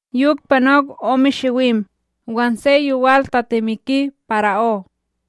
Yok panok ome shiwim, wan se yowal tatemiki para'ó: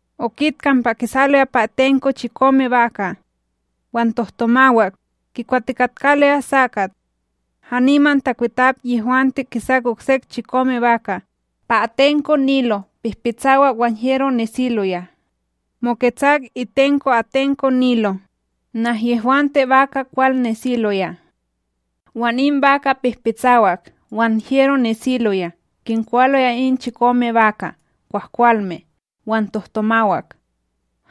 okit kampa, kisaloya pa atenko chikome baka' wan tohtomawak kikwatikatkaloya sakat. Haniman takwitap yehwante kisak oksek chikome baka', pa atenko Nilo pihpitsawak wan hyero nesiloya, moketsak itenko atenko Nilo, nahyehwante baka' kwal nesiloya. Wan in baka' pihpitsawak wan hyero nesiloya kinkwaloya in chikome baka' kwahkwalme wan tohtomawak!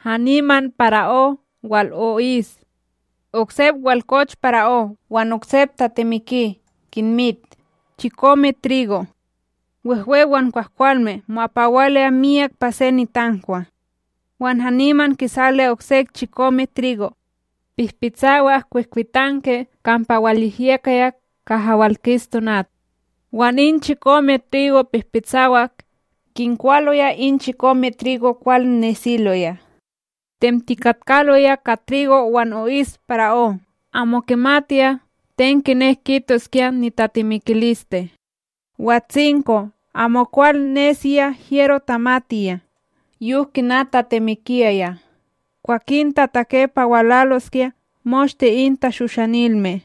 Haniman para'ó wal o'is. Oksep walkoch para'ó, wan oksep tatemiki: Kinmit chikome trigo, wehwe wan kwahkwalme, mo'apawaloya myak pa se nitankwa. Wan haniman kisaloya oksek chikome trigo, pihpitsawak kwihkwitanki kampa walyehyekaya kaha walkis tonat. Wan in chikome trigo pihpitsawak kinkwaloya in chikome trigo kwal nesiloya! Temtikatkaloya ka trigo wan o'is para'ó amo kimatiya ten kinek kitoskya nitatemikiliste. Watsinko, amokwal nesiya hyero tamatiya yok kina tatemikiyaya, kwakin tatake pa walaloskya moshte in tashoshanilme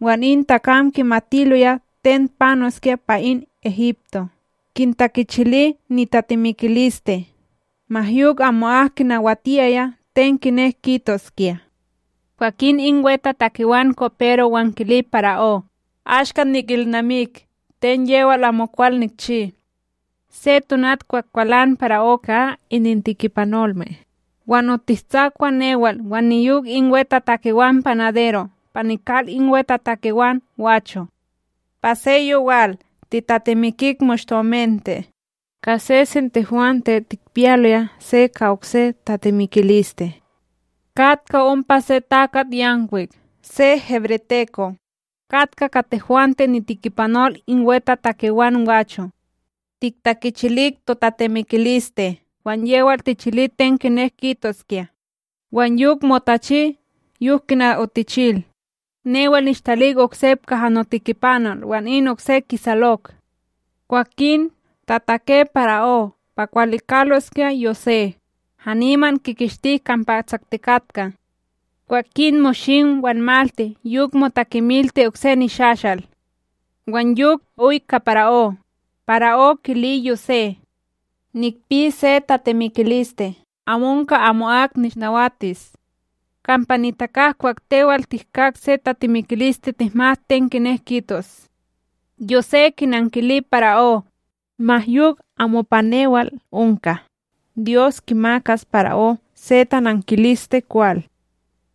wan in takam kimatiloya ten panoskya pa in Egipto, kintakichili nitatemikiliste. Ma yok amo'ak kinawatiyaya ten kinek kitoskya. Kwakin in wetatakewan kopero wan kili para'ó: “Ashka nikilnamik ten yewal amokwal nikchi. Se tonat kwah kwalan para'ó ka inintikipanolme, wan otishtsakwa newal wan niyok in wetatakewan panadero', pa nikal in wetatakewan gwacho'. Pa se yowal, titatemikik moshte omente, ka sesen tehwante tikpiyaloya se ka okse tatemikiliste. Katka ompa se takatYankwik se hebreteko, katka ka tehwante, nitikipanol in wetatakewan gwacho'. Tiktakichilik totatemikiliste, wan yewal tichili ten kinek kitoskya. Wan yok motachi yok kina otichil! Newal nishtalik oksep kaha notikipanol, wan in okse kisalok.” Kwakin tatake para'ó pa kiwalikaloskya Yosé, hanimam kikishtik kampa tsaktikatka. Kwakin moshim wan malti yok motakemilti okse nishashal, wan yok oy ka para'ó, para'ó kili Yosé: ―Nikpi se tatemikiliste amo onka amo'ak nishnawatis. Kampa nitakak kwah tewal tihkak se tatemikiliste, tihmat ten kinek kitos. Yosé kinankili para'ó: ―Ma yok amo pa newal onka, Dyos kimakas para'ó se tanankiliste kwal.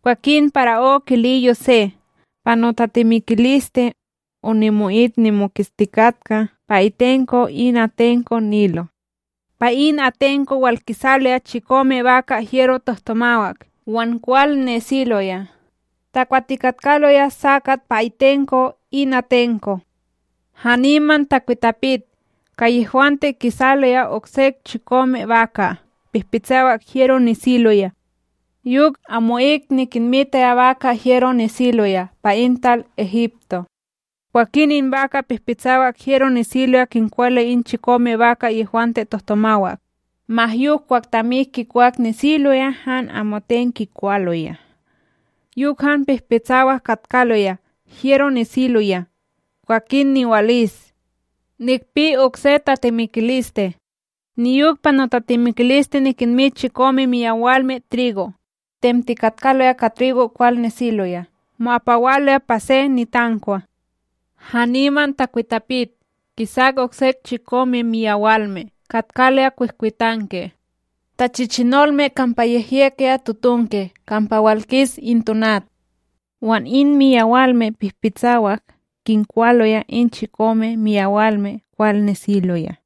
Kwakin para'ó kili Yosé: ―Pa notatemikiliste, onimo'it nimoketstikatka pa itenko in atenko Nilo. Pa in atenko walkisaloya chikome baka' hyero tohtomawak wan kwal nesiloya, takwatikatkaloya sakat pa itenko in atenko. Haniman takwitapit ka yehwante kisaloya oksek chikome baka' pihpitsawak hyero nesiloya. Yok amo'ik nikinmitaya baka' hyero nesiloya pa in tal Egipto! Kwakin in baka' pihpitsawak hyero nesiloya, kinkwaloya in chikome baka' yehwante tohtomawak. Ma yok, kwah tamik kinkwak, nesiloya han amoten kikwaloya, yok han pihpitsawak katkaloya hyero nesiloya. Kwakin niwal is. “Nikpi okse tatemikiliste: Niyok pa notatemikiliste nikinmit chikome miyawalme trigo, temtikatkaloya ka trigo kwal nesiloya mo'apawaloya pa se nitankwa. Haniman takwitapit kisak oksek chikome miyawalme katkaloya kwihkwitanki, tachichinolme kampa yehyekaya totonki kampa walkis in tonat. Wan in miyawalme pihpitsawak kinkwaloya in chikome miyawalme kwal nesiloya.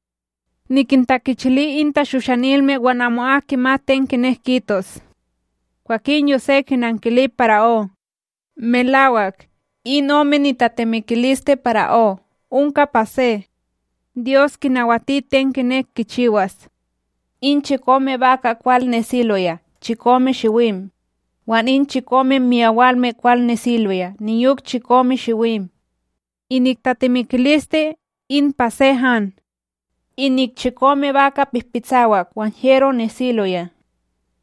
Nikintakichili in tashoshanilme, wan amo'ak kimat ten kinek kitos.” Kwakin Yosé kinankili para'ó: ―Melawak, in ome nitatemikiliste para'ó onka pa se. Dyos kinawati ten kinek kichiwas. In chikome baka' kwal nesiloya chikome shiwim. Wan in chikome miyawalme kwal nesiloya niyok chikome shiwim. Inik tatemikiliste in pa se han. Inik chikome baka' pihpitsawak wan hyero nesiloya,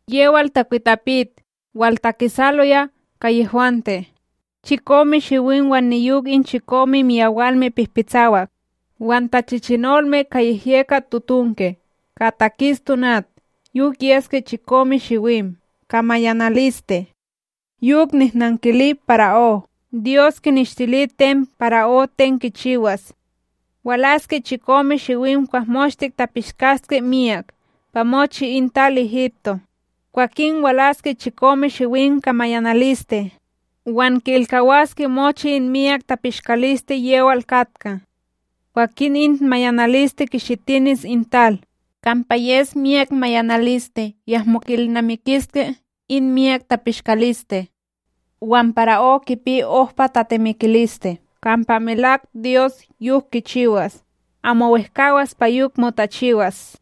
yewal takwitapit waltakisaloya ka yehwante, chikome shiwim wan niyok in chikome miyawalme pihpitsawak wan tachichinolme ka yehyekat totonki kaha takis tonat yok yeske chikome shiwim ka mayanaliste. Yok nihnankili para'ó, Dyos kineshtili ten para'ó ten kichiwas. Walaske chikome shiwim kwah moshte tapishkaske miyak pa mochi in tal Egipto, kwakin walaske chikome shiwim ka mayanaliste, wan ki'ilkawaske mochi in miyak tapishkaliste yewal katka. Kwakin in mayanaliste kishitinis in tal! Kampa yes miyak mayanaliste, yahmo ki'ilnamikiske in miyak tapishkaliste. Wan para'ó kipi ohpa tatemikiliste kampa melak Dyos yok kichiwas, amo wehkAwas pa yok motachiwas.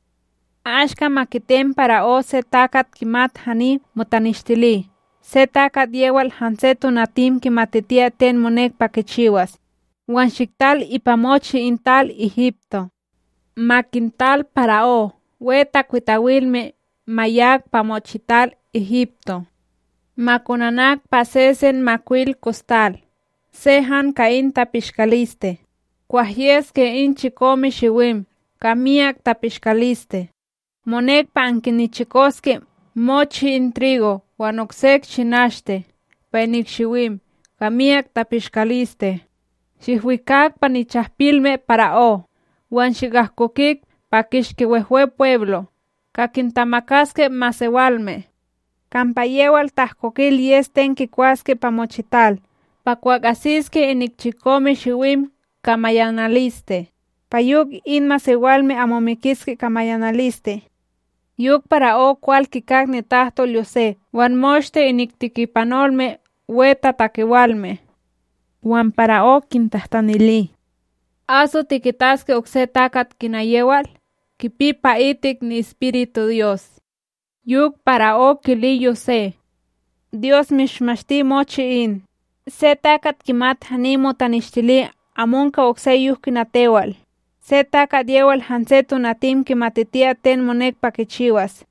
“Ashka, ma kitem para'ó se takat kimat hani motanishtili, se takat yewal hanse tonatim kimatitiyas ten monek pa kichiwas, wan shiktal ipa mochi in tal Egipto. Ma kintal para'ó wetakwitawilme ma yak pa mochital Egipto, ma konanak pa sesen makwil kostal se han ka in tapishkaliste kwah yeske in chikome shiwim ka miyak tapishkaliste. Monek pa ankinichikoske mochi in trigo wan oksek shinashte pa inik shiwim ka miyak tapishkaliste shihwikak pa nichahpilme para'ó wan shikahkokik pa kishki Wehwepweblo', ka kintamakaske masewalme. Kampa yewal ta'ahkokil yes ten kikwaske pa mochital pa kwah asiske inik chikome shiwim ka mayanaliste, pa yok in masewalme amo mikiske ka mayanaliste.” Yok para'ó kwal kikak nitahtol Yosé wan moshte inik tikipanolme wetatakewalme. Wan para'ó kintahtanili: ―Aso tikitaske okse takat kina yewal, kipi pa'itik ni'Espíritu Dyos? Yok para'ó kili Yosé: ―Dyos mishmashti mochi in, se takat kimat hani motanishtili amo onka okse yok kina tewal, se takat yewal hanse tonatim kimatitiya ten monek pa kichiwas.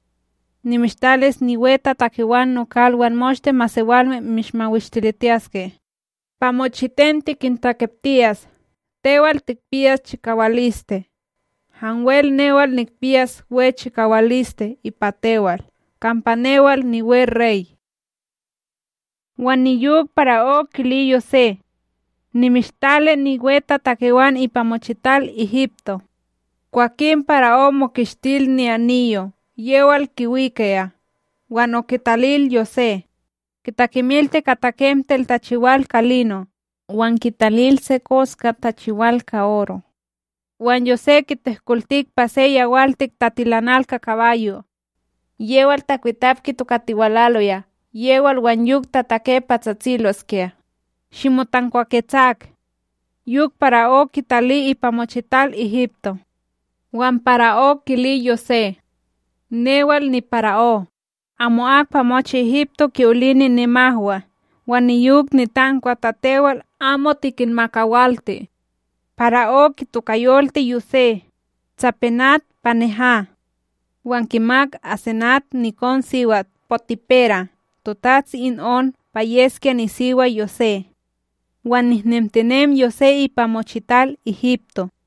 Nimishtalis niwetatakewan nokal wan moshte masewalme mishmawishtilitiyaske, pa mochiten tikintakiptiyas. Tewal tikpiyas chikawaliste, hanwel newal nikpiyas we chikawaliste ipa tewal, kampa newal niwerey. Wan niyok para'ó kili Yosé: ―Nimishtali niwetatakewan ipa mochital Egipto. Kwakin para'ó mokishtil ni'aniyo yewal kiwikaya wan okitalil Yosé. Kitakemilti ka takemtel tachiwal ka lino, wan kitalil se koskat tachiwal ka oro. Wan Yosé kitehkolti pa se yawaltik tatilanal ka kabayo' yewal takwitap kitokatiwalaya yewal wan yok tatake pa tsatsiloskya: “Shimotankwaketsak!” Yok para'ó kitali ipa mochital Egipto. Wan para'ó kili Yosé: ―Newal nipara'ó, amo'ak pa mochi Egipto ki'olini nimahwa wan niyok nitankwa, ta tewal amo tikinmakawalti. Para'ó kitokayolti Yosé, Tsapenat-panéha; wan kimak Asenat, nikonSiwat Potipera, totats in On pa yeskya nisiwa Yosé. Wan nehnemtinem Yosé ipa mochital Egipto.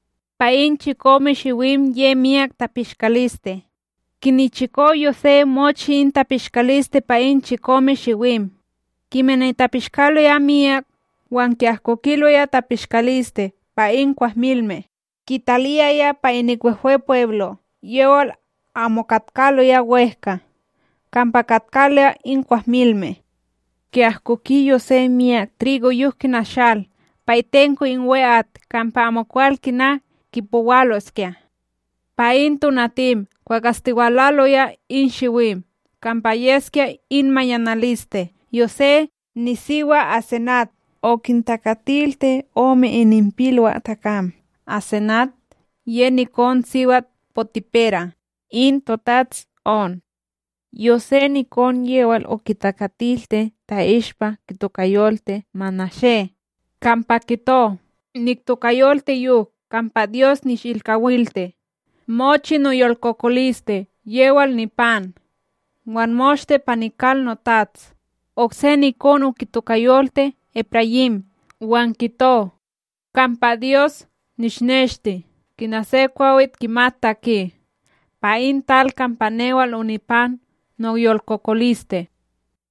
Pa in chikome shiwim ye miyak tapishkaliste, kinichiko Yosé mochi in tapishkaliste pa in chikome shiwim, kimani tapishkaloya miyak wan ki'ahkokiloya tapishkaliste pa in kwahmilme kitaliyaya pa inik Wehwepweblo' yewal amo katkaloya wEhka kampa katkaloya in kwahmilme. Ki'ahkoki Yosé miyak trigo, yok kina shal pa itenko in we'at. Kampa amokwal kina kipowaloskya! Pa in tonatim kwah astiwalaloya in shiwim kampa yeskya in mayanaliste, Yosé nisiwa Asenat, okintakatilti ome ininpilwaTakam Asenat ye nikonSiwat Potipera in totats On. Yosé nikon yewal okitakatilti ta'ishpa kitokayolti Manashé, kampa kito: “Niktokayolti yok kampa Dyos nishilkawilti mochi noyolkokoliste yewal nipan, wan moshte pa nikal notats.” Okse nikon okitokayolti Eprayím, wan kito: “Kampa Dyos nishneshti kina se kwawit kimat taki pa in tal kampa newal onipan noyolkokoliste.”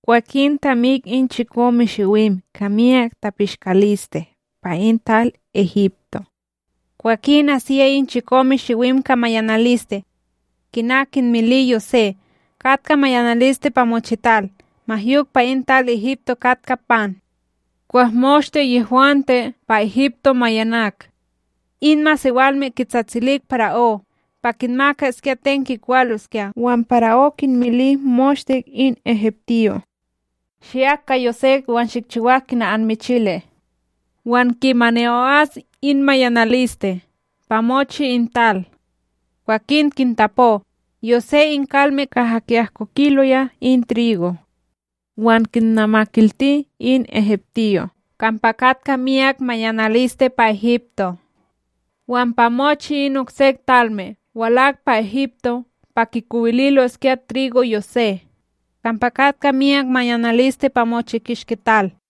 Kwakin tamik in chikome shiwim ka miyak tapishkaliste pa in tal Egipto kwakin asiyaya in chikome shiwim ka mayanaliste, kina kinmili Yosé. Katka mayanaliste pa mochital ma yok pa in tal Egipto katka pan. Kwah moshte yehwante pa Egipto mayanak, in masewalme kitsatsilik para'ó pa kinmakaskya ten kikwaloskya. Wan para'ó kinmili moshte in egiptiyo': “Shiyak ka Yosé wan shikchiwak kina anmichili.” Wan kimani o'as in mayanaliste pa mochi in tal, kwakin kintapo Yosé in kalme kaha kinahkokiloya in trigo wan kinnamakilti in egiptiyo' kampa katka miyak mayanaliste pa Egipto. Wan pa mochi in oksek talme walak pa Egipto pa kikowililoskya trigo Yosé, kampa katka miyak mayanaliste pa mochi kishki tal.